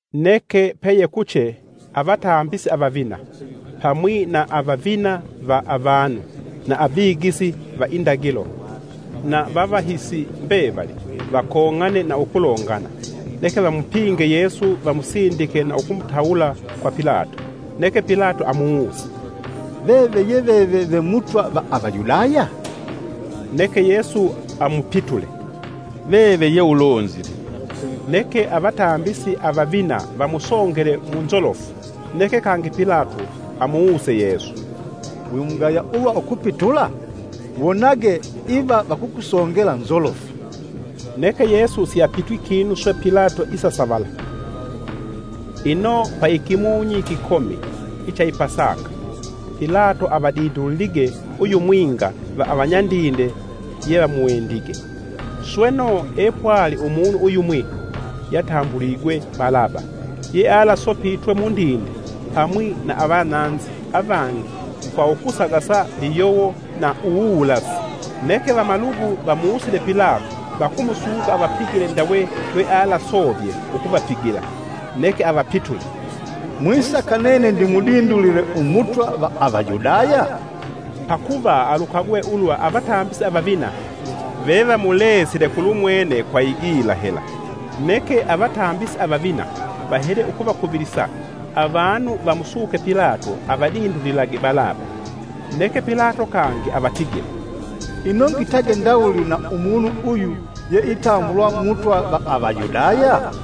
Neke peyekuche avatambisi avavina, pamwi na avavina va avanu na avigisi va indagilo, na vavahisi mbevali vakong'ane na ukulongana; neke vamupinge Yesu vamusindike na ukumutawula kwa Pilato. Neke Pilato amuwuse, “Veve ye veve ve Mutwa va Avayudaya?” Neke Yesu amupitule, “Veve ye ulonzile.” Neke Avatambisi avavina vamusongele mu nzolofu. Neke kangi Pilato amuwuse Yesu, “Wimugaya ulwa ukupitula? Wonage iva vakukusongela nzolofu.” Neke Yesu siapitwi kinu swe Pilato isasavala. Ino paikimunyi ikikomi icha i Pasaka Pilato avadindulilige uyumwinga va avanyandinde yevamuwendige. Sweno, epwali umunu uyumwi yatambuligwe Balaba yealasopitwe mundinde pamwi na avananzi avangi kwa ukusagasa liyowo na uwuwulasi. Neke vamalugu vamusile Pilato vakumusuka avapigile ndawe lwealasovye ukuvapigila. Neke avapitule, “Mwisaka nene ndimudindulile Umutwa va Avayudaya?” Pakuva alukagwe ulwa avatambisi avavina vevamulesile kulumwene kwa igila hela. Neke avatambisi avavina vahele ukuvakuvilisa avanu vamusuke Pilato avadindulilage Balaba. Neke Pilato kangi avatigile, “Ino ngitage ndawuli na umunu uyu ye itambulwa Mutwa va Avayudaya?”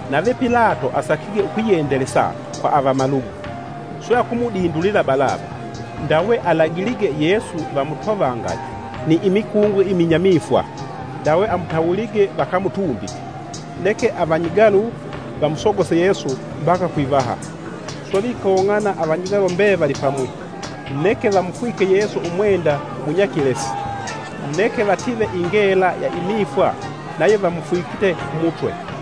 Nave Pilato asakige ukwiyendelesa kwa avamalugu, swe akumudindulila Balaba. Ndawe alagilige Yesu vamutovangage ni imikungo iminyamifwa, ndawe amutawulige vakamutumbike. Neke avanyigalu vamusogose Yesu mbaka kwivaha; swe vikong'ana avanyigalu mbevali pamwi. Neke vamufwike Yesu umwenda ugunyakilesi, neke vative ingela ya imifwa nayo vamufwikite kumutwe.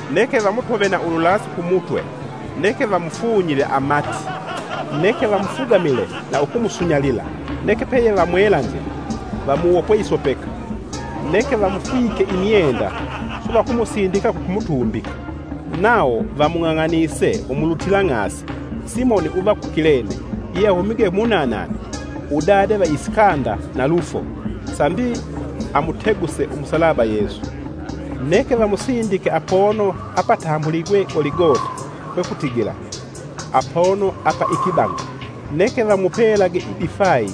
Neke vamutove na ululasi kumutwe neke vamufunyile amati, neke vamufugamile na ukumusunyalila. Neke peyevamwelanzile, vamuwopwe isopeka neke vamufwike imyenda swe vakumusindika kukumutumbika. Nawo vamung'ang'anise umulutilang'asi, Simoni uva ku Kilene yeahumige munanana, Udade va Isikanda na Lufo, sambi amuteguse umusalaba Yesu. Neke vamusindike apono apatambuligwe Goligota kwekutigila, “Apono apa ikibang'a”. Neke vamupelage idifayi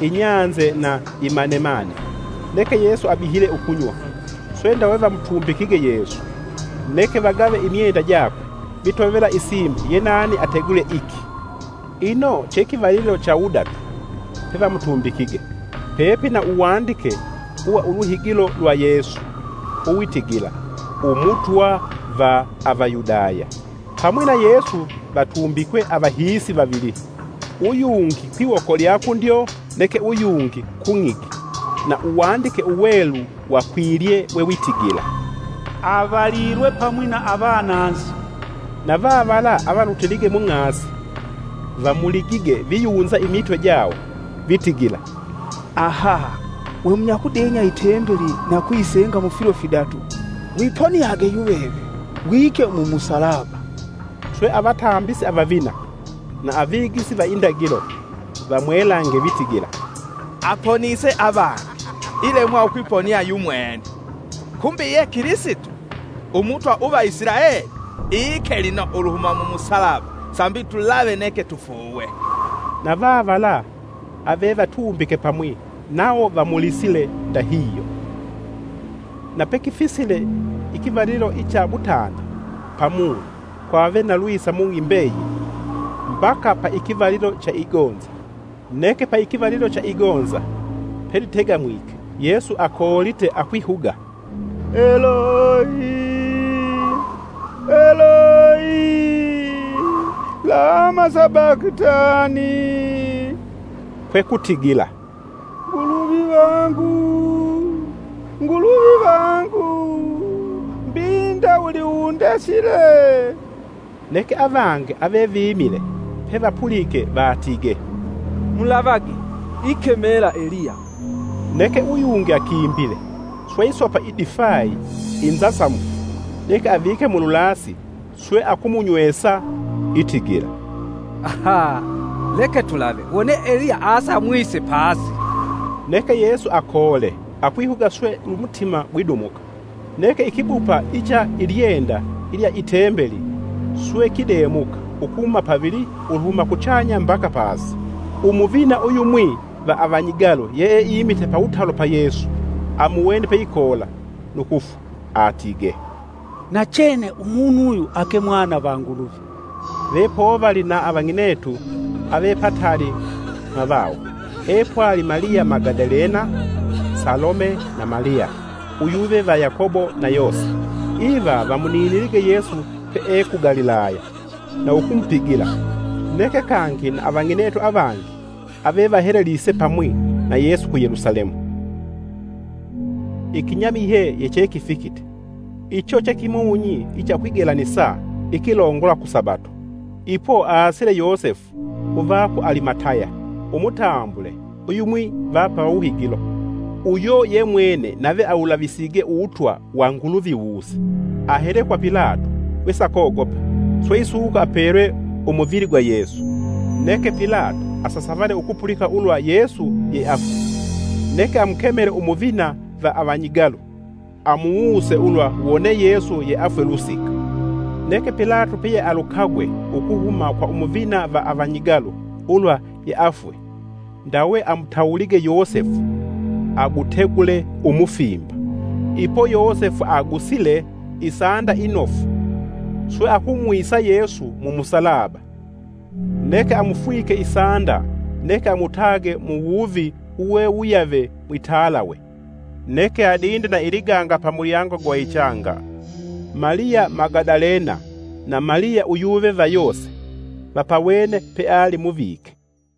inyanze na imanemane, neke Yesu abihile ukunywa. Swe ndawe vamutumbikige Yesu, neke vagave imyenda jakwe vitovela isimbi ye nani ategule iki. Ino che kivalilo cha wudatu, pevamutumbikige. Pepina uwandike uwa uluhigilo lwa Yesu uwitigila, “Umutwa va Avayudaya.” Pamwi na Yesu vatumbikwe avahiisi vavili, uyungi kwiwoko lya kundyo neke uyungi kung'igi. [ Na Uwandike Uwelu wakwilye wewitigila, “Avalilwe pamwi na avananzi.”] Na vavala avalutilige mung'asi vamuligige viyunza imitwe jawo vitigila, “Aha! Vemunyakudenya itembeli na ukuyisenga mufilo fidatu! Wiponiage yuveve wike mumusalaba!” Swe avatambisi avavina na avigisi va indagilo vamwelange vitigila, “Aponise avangi, ilemwa ukwiponia yu mwene! Kumbi ye Kilisito, Umutwa uva Isilaeli! Ike lino uluhuma mu musalaba sambi tulave neke tufuuwe.” Na vavala avevatumbike pamwi nawo vamulisile ndahihyo. Na pekifisile ikivalilo icha mutanda pamunyi kwave na lwisa mung'i mbeyili mbaka pa ikivalilo icha igonza. Neke paikivalilo icha igonza pelitegamwike Yesu akoolite kwihuga, “Eloi, Eloi, lama sabakitani?” Kwekutigila, “Nguluvi vangu, Nguluvi vangu, mbi ndawuli undesile?” Neke avangi avevimile pevapulike vatigee, “Mulavage! Ikemela Eliya.” Neke uyungi akimbile, swe isopa idifayi inzasamufu neke avike mululasi swe akumunywesa itigila, “Leke tulave wone Eliya aasa amwise pasi!” Neke Yesu akoole akwihuga swe Umutima gwidumuka. Neke ikibupa icha ilyenda lya i tembeli swe kidemuka kihuma pavili uluhuma kuchanya mbaka pasi. Umuvina uyumwi va avanyigalu yeeimite pawutalo pa Yesu amuwene peikoola nu kufwa, atigee, “Nachene Umunu uyu ake Mwana va Nguluvi!” Ve povali na avang'inetu ave pataali mwavawo, epwali Maliya Magadalena, Salome na Maliya uyuve va Yakobo na Yose. Iva vamuninilige Yesu pee ku Galilaya, na ukumupigila, neke kangi na avang'inetu avangi avevahelelige pamwi na Yesu ku Yelusalemu. Ikinyamihye yechekifikite. Icho che kimunyi icha ukwigelanisa ikilongola kusabato. Ipo aasile Yosefu uva ku Alimataya, umutambule uyumwi va pawuhigilo. Uyo yemwene nave awulavisige uwutwa wa Nguluvi wuuse. Ahele kwa Pilato wesakogopa, swe isuka apelwe umuvili gwa Yesu. Neke Pilato asasavale ukupulika ulwa Yesu yeafwe; neke amukemele umuvina va avanyigalu, amuwuse ulwa wone Yesu yeafwe lusika. Neke Pilato peyealukagwe ukuhuma kwa umuvina va avanyigalu ulwa Yeafwe, ndawe amutawulige Yosefu agutegule umufimba. Ipo Yosefu agusile isanda inofu swe akumwisa Yesu mumusalaba neke amufwike isanda neke amutage muwuvi uwe wuyave mwitalawe, neke adinde na iliganga pamulyango gwa ichanga. Maliya Magadalena na Maliya uyuve va Yose vapawene peali muvike.